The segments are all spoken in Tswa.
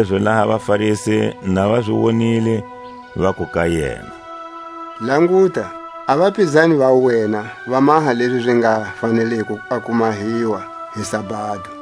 Kanilezi laha a vaFarisi na va zi wonile, vaku ka yena: Languta, a vapizani va wena va maha lezi zi nga faneliko a ku mahiwa hi sabado.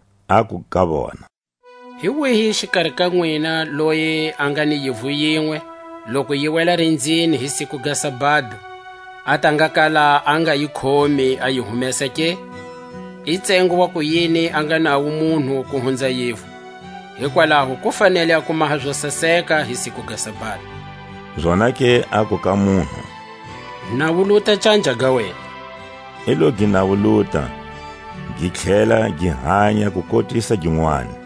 Aku ka vona: Hi wihi xikari ka nwina, loyi a nga ni yivu yinwe, loku yi wela rinzini hi siku ga sabado, a ta nga kala a nga yi khomi a yi humesa ke? I tsengo waku yini a nga nawo munhu ku hunza yivu! Hikwalaho ku fanele a ku maha zo saseka hi siku ga sabado. Zonake aku ka munhu: Nawuluta canja ga wena. I lo gi nawuluta, gi tlhela gi hanya kukotisa ginwani.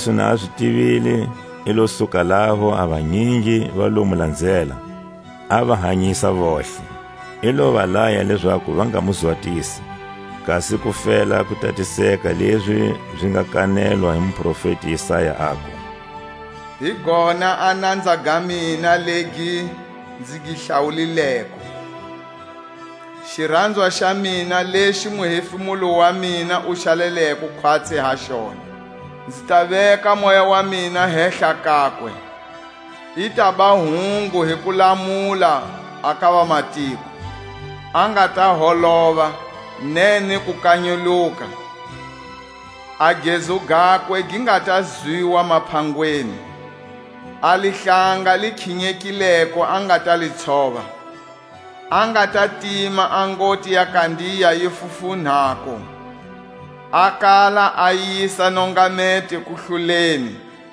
Jesu na a zi tivile i lo suka laho; a vanyingi va lo mu lanzela, a va hanyisa vontlhe. I lo va laya lezaku va nga mu zwatisi, kasi ku fela ku tatiseka lezi zi nga kanetwa hi muprofeti Isaya, aku: Hi gona a nanza ga mina legi nzi gi hlawulileko; Xiranzwa xa mina lexi muhefemulo wa mina wu xaleleko khwatsi ha xona. Nzi ta veka Moya wa mina hehla kakwe, i taba hungu hi kulamula a ka vamatiko. A nga ta holova, ne ni ku kanyuluka; A gezu gakwe gi nga ta zwiwa maphangweni. A lihlanga li khinyekileko a nga ta li tshova, A nga ta tima a ngoti ya kandiya yi fufunhako, A kala a yisa nongameto kuhloleni;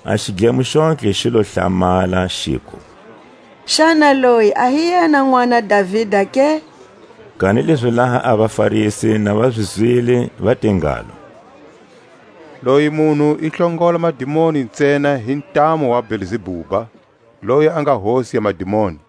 A xidlemo xontlhe xi lo hlamala, xiku: Xana loyi a hi yena nʼwana Davida ke? Kanilezi laha a vaFarisi na va zi zwile, va te ngalo: Loyi munhu i hlongola madimoni ntsena hi ntamu wa Belzebuba, loyi a nga hosi ya madimoni.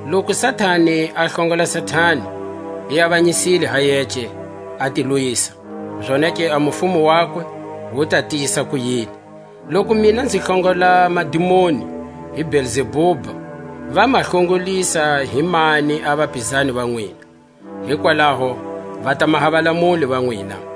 Loku Satani a hlongola Satani, i avanyisile ha yece, a ti lwisa; zonake a mufumo wakwe wu ta tiyisa kuyini? Loku mina nzi hlongola madimoni hi Belzebuba, va ma hlongolisa hi mani a vapizani va nwina? Hikwalaho va ta maha valamuli va nwina.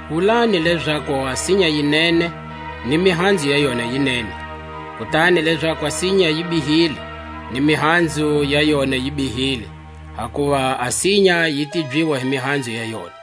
Wulani lezaku a sinya yi nene, ni mihanzu ya yona yi nene; kutani lezaku a sinya yi bihile, ni mihanzu ya yona yi bihile; hakuva a sinya yi tibyiwa hi mihanzu ya yona.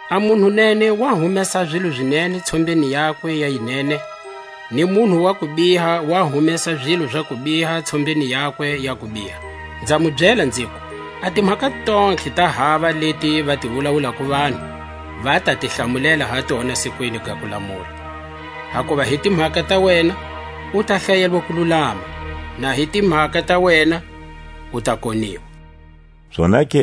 A munhu nene wa humesa a zilo zi nene tshombeni yakwe ya yinene; ni munhu wa kubiha wa humesa zilo za kubiha tshombeni yakwe ya kubiha. Nza mu byela, nziku: A timhaka tontlhe ta hava leti va ti wulawulako vanhu, va ta ti hlamulela ha tona sikwini ga kulamula. Hakuva hi timhaka ta wena u ta hlayelwa kululama; na hi timhaka ta wena u ta koniwa. Jesu a ala ku maha ziwoniso.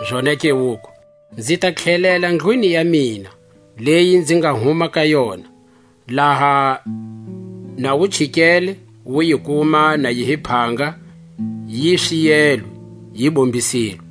Zonake wuku: Nzi ta tlhelela ndlwini ya mina, leyi nzi nga huma ka yona; laha na wu chikele, wu yi kuma na yi hi phanga, yi swiyelwe, yi bombisilwe.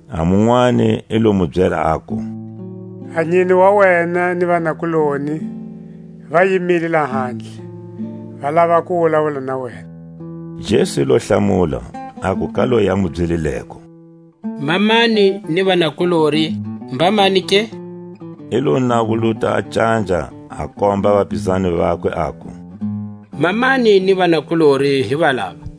A munwani i lo mu byela, aku: A nyine wa wena ni vanakuloni va yimile lahandle, va lava ku wulawula na wena. Jesu i lo hlamula, aku ka loyi a mu byelileko: Mamani ni vanakulori mbamani ke? I lo nawuluta canja a komba vapizani vakwe, aku: Mamani ni vanakulori hi valava!